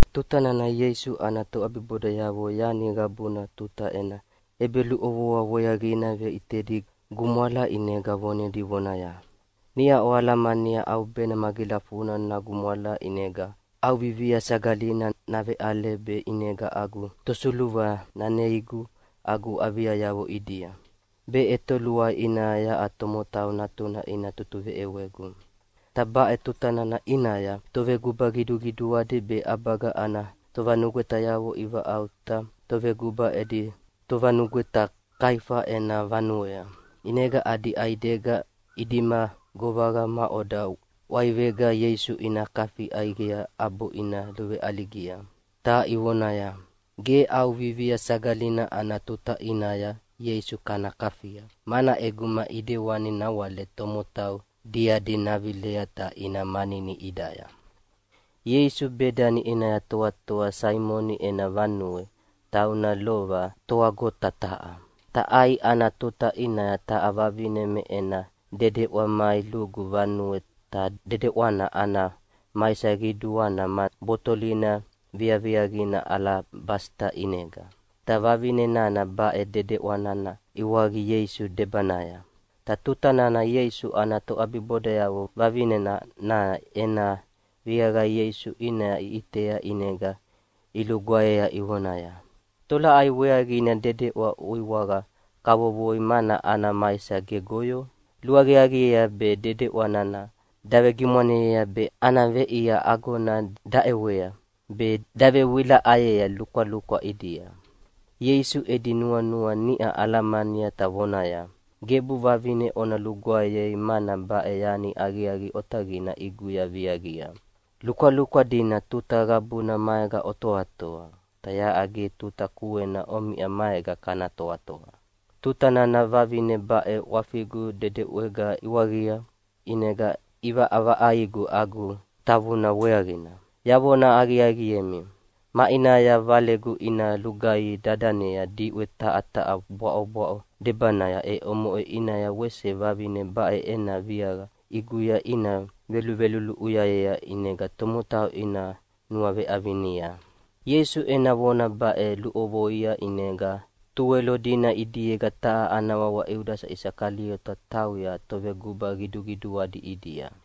Tuta nana Ieisu ana toʼabibodayavo yani qabuna tuta ena ʼebeluʼovoa weaqina veʼitedi gumwala ʼinega vonedi vonaya, “Niʼa oalamania ʼaubena magilafuna nagumwala ʼinega ʼAuvivia Sagalina naveʼale, be ʼinega agu tosuluva naneiegu agu aviayavo ʼidia, be ʼetoluai ʼinaya yaʼa Tomotau Natuna ina tutuveʼewegu.” Ta baʼe tuta nana ʼinaya toveguba qiduqiduadi be ʼabaga ana tovanugwetayavo ivaʼauta toveguba edi tovanugweta Kaiafa ena vanuea. ʼInega adi ʼaidega idima govaqa maʼoda ʼwaivega Ieisu ina kafi ʼaiqei ʼabo ina luveʼaligia. Ta ivonaya, “Ge ʼAuvivia Sagalina ana tuta ʼinaya Ieisu kana kafia, mana ʼeguma ʼidewani nawale tomotau diadi navilea ta ina manini ʼidaya.” Ieisu Bedani ʼinaya toatoa Saimoni ena vanuea, tauna lova toʼwagota taha. Ta ʼai ana tuta ʼinaya taha vavine me ena dedeʼwa mai lugu vanuea, ta dedeʼwa nana ana maisa qiduana ma botolina viaviaqina alabasita ʼinega. Ta vavine nana baʼe dedeʼwa nana iwaqia Ieisu debanaya. Ta tuta nana Ieisu ana toʼabibodayavo vavine nana ena viaqa Ieisu ʼinaya iʼitea ʼinega ilugwaeyea ivonaya, “Tolaʼai weaqina dedeʼwa uiwaqa kavovoi mana ana maisa gegoyo? Luaqiaqiea be dedeʼwa nana davegimwaneyea be ana veʼia agona daʼewea be davewilaʼayea lukwalukwa ʼidia.” Ieisu edi nuanua niʼa alamania ta vonaya, “Gebu vavine ona lugwaeyei mana baʼe yani aqiaqi otaqina ʼiguya viaqia. Lukwalukwa dina tuta qabuna maega otoatoa, ta yaʼa ge tuta kuena omiʼa maega kana toatoa. Tuta nana vavine baʼe ʼwafigu dedeʼwega iwaqia, ʼinega ʼivaʼavaʼaigu agu tavuna weaqina. Yavona aqiaqiemi, maʼinaya Valegu ina lugaihi dadanea diʼwe taha taha bwaʼobwaʼo debanaya, e omoʼe ʼinaya wese vavine baʼe ena viaqa ʼiguya ina veluluʼuyayea ʼinega tomotau ina nuaveʼavinia.” Ieisu ena vona baʼe luʼovoia ʼinega Tuwelo dina ʼidiega taha ana wawa Iudasa Isakaliota tauya toveguba qiduqiduadi ʼidia,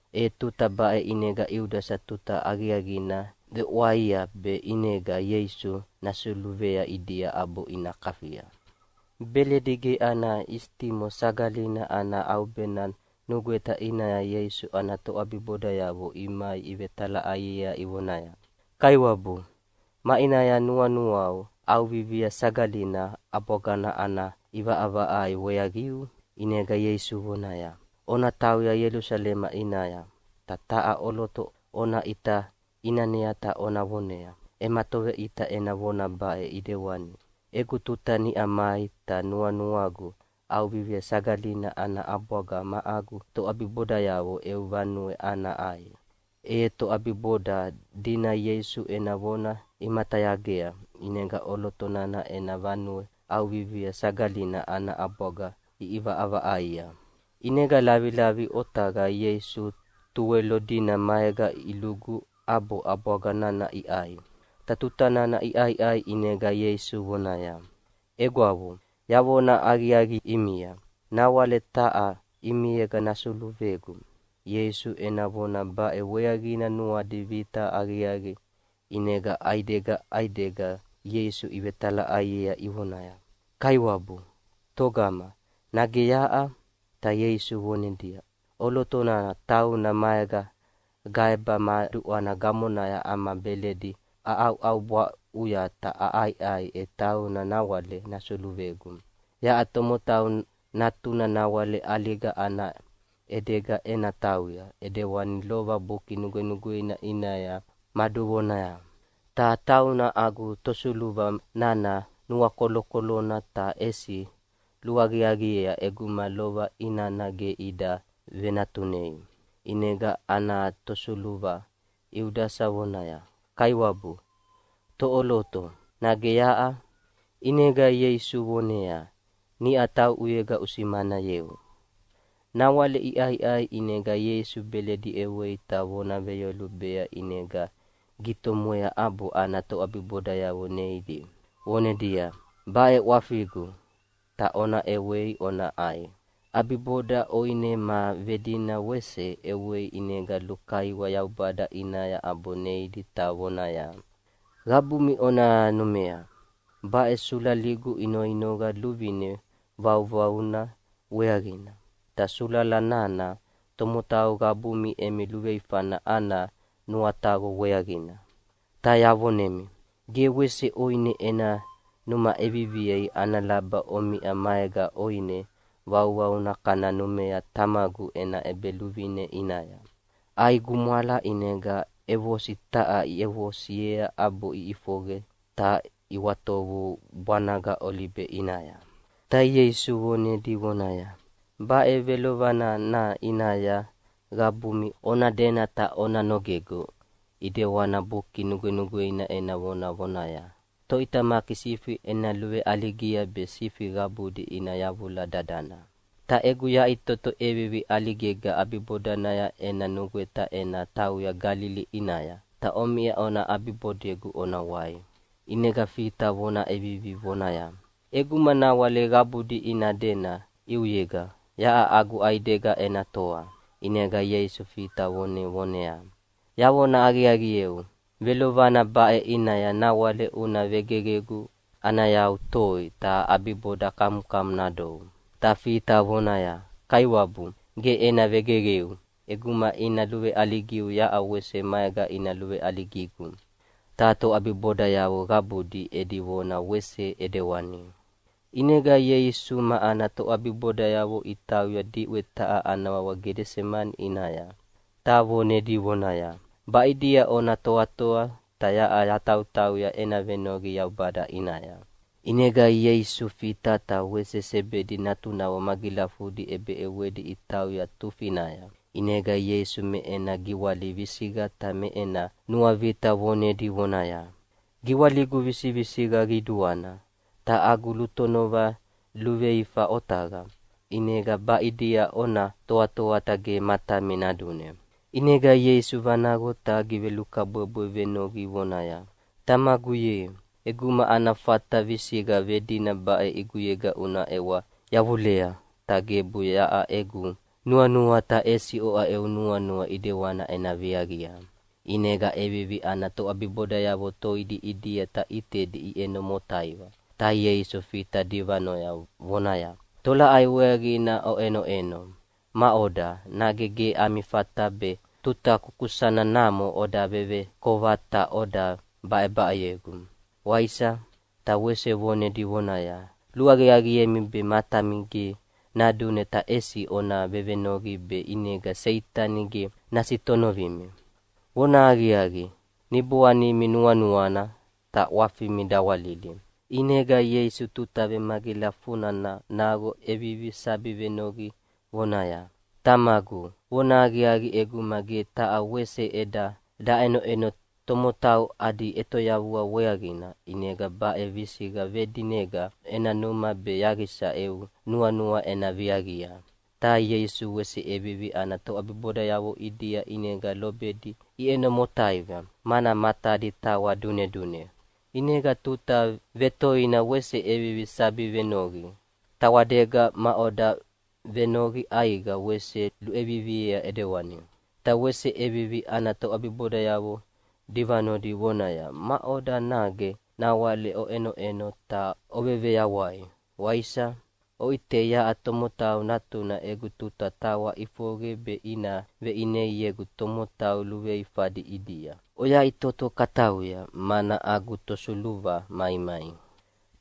E tuta baʼe ʼinega Iudasa tuta aqiaqina vewaʼia be ʼinega Ieisu nasuluvea ʼidia ʼabo ina kafia. Beledi ge ana isitimo Sagalina ana ʼaubena nugweta ʼinaya Ieisu ana toʼabibodayavo imai ivetalaʼaiea ivonaya, “Kaiwabu, maʼinaya nuanuau ʼAuvivia Sagalina ʼabwagana ana ʼivaʼavaʼaia weaqiu?” ʼInega Ieisu vonaya, “Ona tauya Ielusalema ʼinaya, ta taha ʼoloto ona ʼita ʼinanea ta ona vonea. Ema toveʼita ena vona baʼe ʼidewani: Egu tuta niʼa mai ta nuanuagu ʼAuvivia Sagalina ana ʼabwaga ma agu toʼabibodayavo eu vanuea ana ʼai.” E toʼabiboda dina Ieisu ena vona imatayagea, ʼinega ʼoloto nana ena vanuea ʼAuvivia Sagalina ana ʼabwaga iʼivaʼavaʼaia. ʼInega lavilavi otaqaya Ieisu Tuwelo dina maega ilugu, ʼabo ʼabwaga nana iʼai. Ta tuta nana iʼaiʼai ʼinega Ieisu vonaya, “Egwavo, yavona aqiaqi ʼimia, nawale taha ʼimiega nasuluvegu.” Ieisu ena vona baʼe weaqina nuadi vita aqiaqi, ʼinega ʼaidega ʼaidega Ieisu ivetalaʼaiea ivonaya, “Kaiwabu, togama, nage yaʼa?” Ta Ieisu vonedia, “ʼOloto nana tauna maega gaeba ma duʼwana gamonaya ama beledi aʼauʼaubwaʼuya ta aʼaiʼai, e tauna nawale nasuluvegu. Yaʼa Tomotau Natuna nawale ʼaliga ana ʼedega ena tauya ʼidewani lova Buki Nugwenugweina ʼinaya maduvonayea, ta tauna agu tosuluva nana nuakolokolona, ta ʼesi luaqiaqiea ʼeguma lova inana ge ida venatunei.” ʼInega ana tosuluva, Iudasa vonaya, “Kaiwabu, toʼoloto, nage yaʼa?” ʼInega Ieisu voneaya, “Niʼa tauʼuyega usimanayeu.” Nawale iʼaiʼai ʼinega Ieisu beledi ʼewei ta vona veyolubea ʼinega gitomwea ʼabo ana toʼabibodayavo neidi, vonedia, “Baʼe ʼwafigu, ta ona ʼewei ona ʼai.” ʼAbiboda ʼoine ma vedina wese ʼewei ʼinega lukaiwa Yaubada ʼinaya ʼabo neidi ta vonaya, “Qabumi ona numea, baʼe sulaligu inoinoqa luvine vauvauna weaqina, ta sulala nana tomotau qabumi emi luveifana ana nuataqo weaqina. Ta yavonemi, ge wese ʼoine ena numa ʼeviviei ana laba omiʼa maega ʼoine vauvauna kana numea Tamagu ena ʼEbeluvine ʼinaya.” ʼAi gumwala ʼinega ʼevosi taha iʼevosiea ʼabo iʼifoqe ta iʼwatovu bwanaga Olibe ʼinaya. Ta Ieisu vonedi vonaya, “Baʼe velovana nana ʼinaya qabumi ona dena ta ona nogegu ʼidewana Buki Nugwenugweina ena vona vonaya, ‘Toʼitamaki sifi ena luveʼaligia be sifi qabudi ina yavula dadana.’ “Ta egu yaʼitoto ʼevivi ʼaligega ʼabibodanaya ena nugweta ena tauya Galili ʼinaya, ta omiʼa ona ʼabibodegu ona wai.” ʼInega Fita vona ʼevivi vonaya, “ʼEguma nawale qabudi ina dena ʼiuyega, yaʼa agu ʼaidega ena toa.” ʼInega Ieisu Fita vonea vonaya, “Yavona aqiaqieu, velovana baʼe ʼinaya nawale una vegeqegu ana yau toi, ta ʼabiboda kamukamu nadou.” Ta Fita vonaya, “Kaiwabu, ge ena vegeqeu! ʼEguma ina luveʼaligiu yaʼa wese maega ina luveʼaligigu.” Ta toʼabibodayavo qabudi edi vona wese ʼidewani. ʼInega Ieisu ma ana toʼabibodayavo itauya diʼwe taha ana wawa Gedesemani ʼinaya, ta vonedi vonaya, “Baʼidia ona toatoa, ta yaʼa yatautauya ena venoqi Yaubada ʼinaya.” ʼInega Ieisu Fita ta wese Sebedi natunavo magilafudi ʼebeʼewedi itauya tufinaya. ʼInega Ieisu me ena giwali visiqa ta me ena nuavita vonedi vonaya, “Giwaligu visivisiqa qiduana, ta agu lutonova luveifa otaqa, ʼinega baʼidia ona toatoa ta ge matami nadune.” ʼInega Ieisu vanaqo ta givelukabwebwe venoqi vonaya, “Tamagu ye, ʼeguma ana fata visiqa vedina baʼe ʼiguyega una ʼewa yavulea, ta gebu yaʼa egu nuanua ta ʼesi oʼa eu nuanua ʼidewana ena viaqia.” ʼInega ʼevivi ana toʼabibodayavo toidi ʼidia ta ʼitedi iʼeno motaiva, ta Ieisu Fita divanoya, vonaya, “Tolaʼai weaqina oʼenoʼeno! Maʼoda, nage ge ami fata be tuta kukusana namo oda vevekova ta oda baʼebaʼeyegu, waisa?” Ta wese vonedi vonaya, “Luaqiaqiemi be matami ge nadune ta ʼesi ona vevenoqi be ʼinega Seitani ge nasitonovimi. Vonahaqiaqi, niboanimi nuanuana, ta ʼwafimi dawalili.” ʼInega Ieisu tuta vemagilafuna naqo ʼevivi sabi venoqi vonaya, “Tamagu, vonahaqiaqi ʼeguma ge taha wese ʼeda daʼenoʼeno tomotau adi ʼetoyavua weaqina, ʼinega baʼe visiqa vedinega ena numa be yaqisa eu nuanua ena viaqia.” Ta Ieisu wese ʼevivi ana toʼabibodayavo ʼidia ʼinega lobedi iʼeno motaiva, mana matadi tawa dunedune. ʼInega tuta vetoina wese ʼevivi sabi venoqi, ta tawadega maʼoda venoqi ʼaiqa wese luʼeviviea ʼidewani. Ta wese ʼevivi ana toʼabibodayavo divanodi vonaya, “Maʼoda, nage nawale oʼenoʼeno ta oveveyawai, waisa? Oʼitei, yaʼa Tomotau Natuna egu tuta tawa ʼifoqe be ina veʼineiegu tomotau luveifadi ʼidia. Oyaʼitoto katauya, mana agu tosuluva maimai.”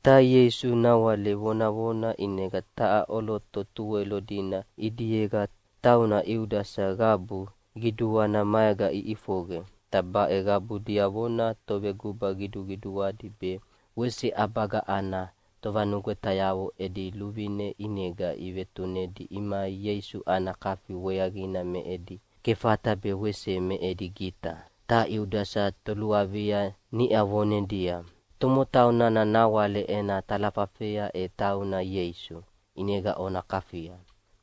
Ta Ieisu nawale vonavona, ʼinega taha ʼoloto Tuwelo dina ʼidiega tauna Iudasa qabu qiduana maega iʼifoqe. Ta baʼe qabu diavona toveguba qiduqiduadi be wese ʼabaga ana tovanugwetayavo edi luvine ʼinega ivetunedi imai Ieisu ana kafi weaqina me edi kefata be wese me edi gita. Ta Iudasa toluavia niʼa vonedia, “Tomotau nana nawale ena talafafea e tauna Ieisu, ʼinega ona kafia.”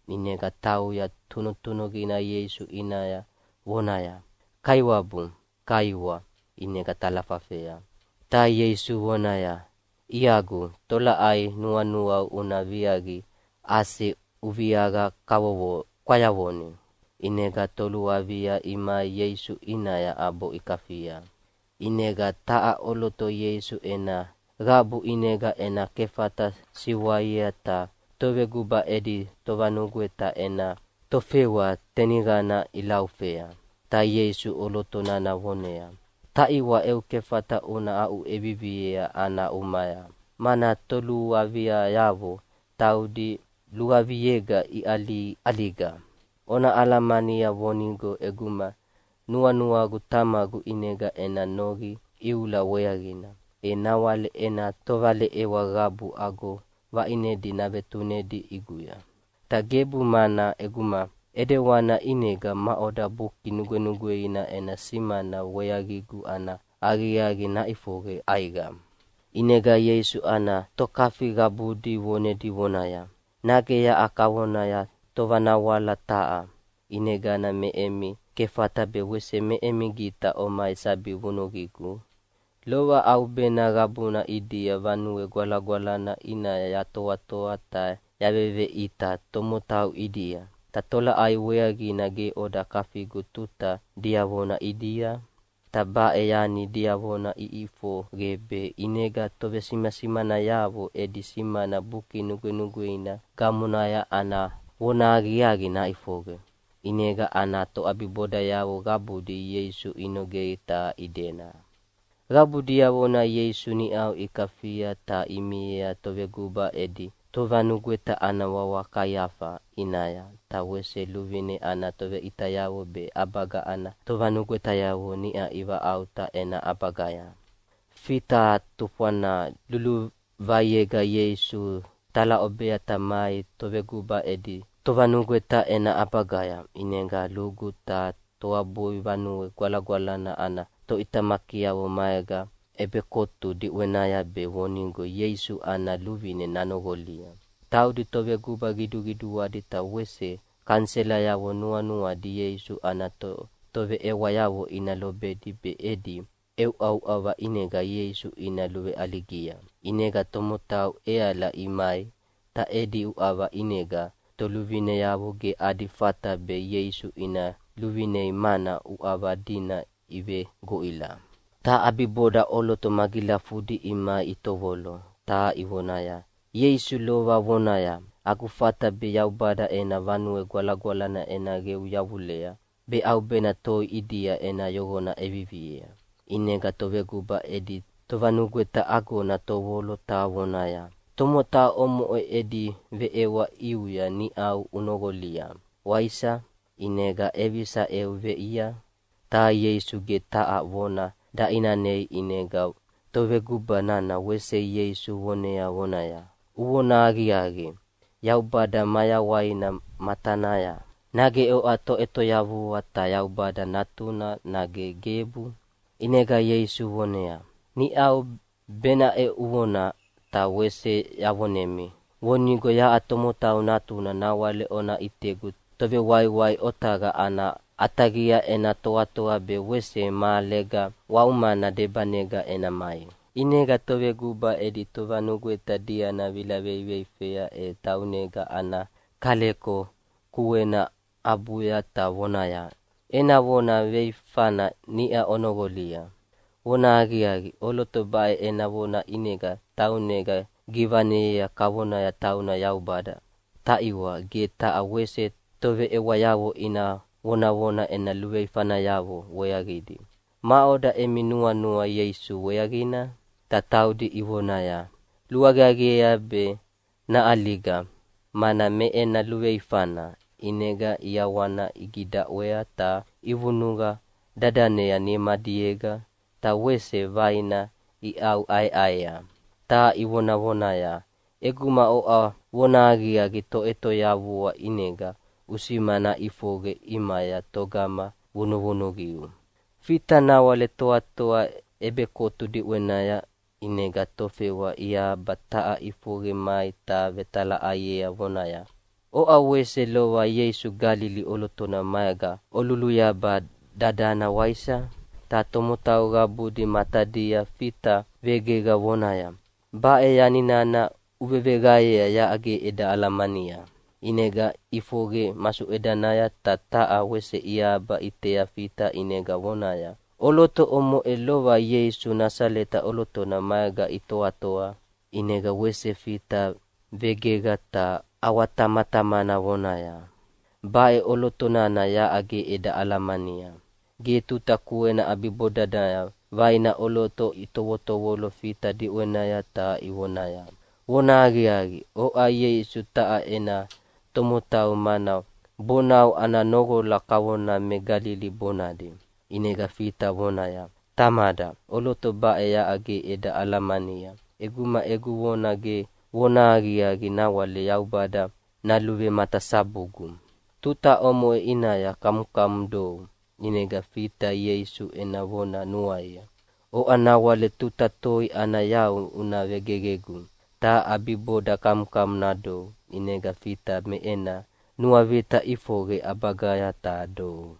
ʼInega tauya tunutunuqina Ieisu ʼinaya vonaya, “Kaiwabu, kaiwa!” ʼinega talafafea. Ta Ieisu vonaya, “Iagu, tolaʼai nuanuau una viaqia ase uviaqa kwayavoni.” ʼInega toluavia imai Ieisu ʼinaya ʼabo ikafia. ʼInega taha ʼoloto Ieisu ena qabu ʼinega ena kefata siwaia ta toveguba edi tovanugweta ena tofewa teniqana ʼilaufea. Ta Ieisu ʼoloto nana vonea, “Taʼiwa! Eu kefata una aʼuʼeviviea ana umaya, mana toluaviayavo taudi luaviayega iʼaliʼaliga. Ona alamania vonigo ʼeguma nuanuagu Tamagu ʼinega ena noqi iula weaqina, e nawale ena tovaleʼewa qabu ago vaʼinedi navetunedi ʼiguya. Ta gebu, mana ʼeguma ʼidewanina ʼinega maʼoda Buki Nugwenugweina ena simana weaqigu ana aqiaqi naʼifoqe ʼaiqa?” ʼInega Ieisu ana tokafi qabudi vonedi vonaya, “Nage yaʼa kavona tovanawala taha, ʼinegana me emi kefata be wese me emi gita omai sabi vunuqigu? Lova ʼaubena qabuna ʼidia Vanue Gwalagwalana ʼinaya yatoatoa ta yaveveʼita tomotau ʼidia, ta tolaʼai weaqina ge oda kafigu tuta diavona ʼidia? Ta baʼe yani diavona iʼifoqe be ʼinega tovesimasimanayavo edi simana Buki Nugwenugweina gamonaya ana vonahaqiaqi naʼifoqe.” ʼInega ana toʼabibodayavo qabudi Ieisu inogei ta idena. Qabu diavona Ieisu niʼau ikafia ta imiea toveguba edi tovanugweta ana wawa Kaiafa ʼinaya, ta wese luvine ana toveʼitayavo be ʼabaga ana tovanugwetayavo niʼa ivaʼauta ena ʼabagaya. Fita tufwana luluvaiega Ieisu talaʼobea ta mai toveguba edi tovanugweta ena ʼabagaya, ʼinega lugu ta toabui Vanue Gwalagwalana ana toʼitamakiavo maega ʼebekotu diʼwenaya be vonigo Ieisu ana luvine nanoqolia. Taudi toveguba qiduqiduadi ta wese kaniselayavo nuanuadi Ieisu ana toveʼewayavo ina lobedi be edi ʼeuʼauʼava ʼinega Ieisu ina luveʼaligia. ʼInega tomotau ʼeala imai, ta edi uʼava ʼinega toluvineavo ge adi fata be Ieisu ina luvinei mana uʼava dina ivegoʼila. Ta ʼabiboda ʼoloto magilafudi imai itovolo, ta ivonaya, “Ieisu lova vonaya, ‘Agu fata be Yaubada ena Vanue Gwalagwalana ena qeu yavulea, be ʼaubena toi ʼidia ena yoqona ʼeviviea.’” ʼInega toveguba edi tovanugweta agona tovolo ta vonaya, “Tomotau omoʼe edi veʼewa ʼiuya niʼau unoqolia, waisa? ʼInega ʼevisa eu veʼia?” Ta Ieisu ge taha vona daʼinanei. ʼInega toveguba nana wese Ieisu vonea vonaya, “Uvonahaqiaqi Yaubada mayawaina matanaya, nage oʼa Toʼetoyavua ta Yaubada Natuna, nage gebu?” ʼInega Ieisu vonea, “Niʼau benaʼe uvona, ta wese yavonemi vonigo yaʼa Tomotau Natuna nawale ona ʼitegu Tovewaiwai otaqa ana ʼataqia ena toatoa be wese mahalega waumana debanega ena mai.” ʼInega toveguba edi tovanugweta diana vila veiveifea e taunega ana kaleko kuena abuya ta vonaya, “Ena vona veifana niʼa onoqolia. Vonahaqiaqi, ʼoloto baʼe ena vona ʼinega taunega givaneyea kavona tauna Yaubada. Taʼiwa, ge taha wese toveʼewayavo ina vonavona ena luveifanayavo weaqidi. Maʼoda emi nuanua Ieisu weaqina?” Ta taudi ivonaya, “Luaqiaqiea be naʼaliga, mana me ena luveifana!” ʼInega ʼiawana igidaʼwea ta ivunuqa dadanea nimadiega, ta wese vaina iʼauʼaeʼaea, ta ivonavonaya, “ʼEguma oʼa vonahaqiaqi Toʼetoyavua ʼinega usimana ʼifoqe ʼimaya togama vunuvunuqiu.” Fita nawale toatoa ʼebekotu diʼwenaya, ʼinega tofewa iahaba taha ʼifoqe mai ta vetalaʼaiea vonaya, “Oʼa wese lova Ieisu Galili ʼolotona maega oluluyaba dadana, waisa?” Ta tomotau qabudi matadia Fita vegeqa vonaya, “Baʼe yani nana uveveqaeyea yaʼa ge eda alamania.” ʼInega ʼifoqe masuʼedanaya ta taha wese iahaba ʼitea Fita ʼinega vonaya, “ʼOloto omoʼe lova Ieisu Nasaleta ʼolotona maega itoatoa.” ʼInega wese Fita vegeqa ta ʼawatamatamana vonaya, “Baʼe ʼoloto nana yaʼa ge eda alamania.” Ge tuta kuena ʼabibodanaya vaina ʼoloto itovotovolo Fita diʼwenaya ta ivoneaya, “Vonahaqiaqi, oʼa Ieisu taha ena tomotau, mana bonau ana noqola kavona me Galili bonadi.” ʼInega Fita vonaya, “Tamada! ʼOloto baʼe yaʼa ge eda alamania! ʼEguma egu vona ge vonahaqiaqi nawale Yaubada naluvematasabugu.” Tuta omoʼe ʼinaya kamukamu dou. ʼInega Fita Ieisu ena vona nuaia, “Oʼa nawale tuta toi ana yau una vegeqegu, ta ʼabiboda kamukamu nadou.” ʼInega Fita me ena nuavita ʼifoqe ʼabagaya ta dou.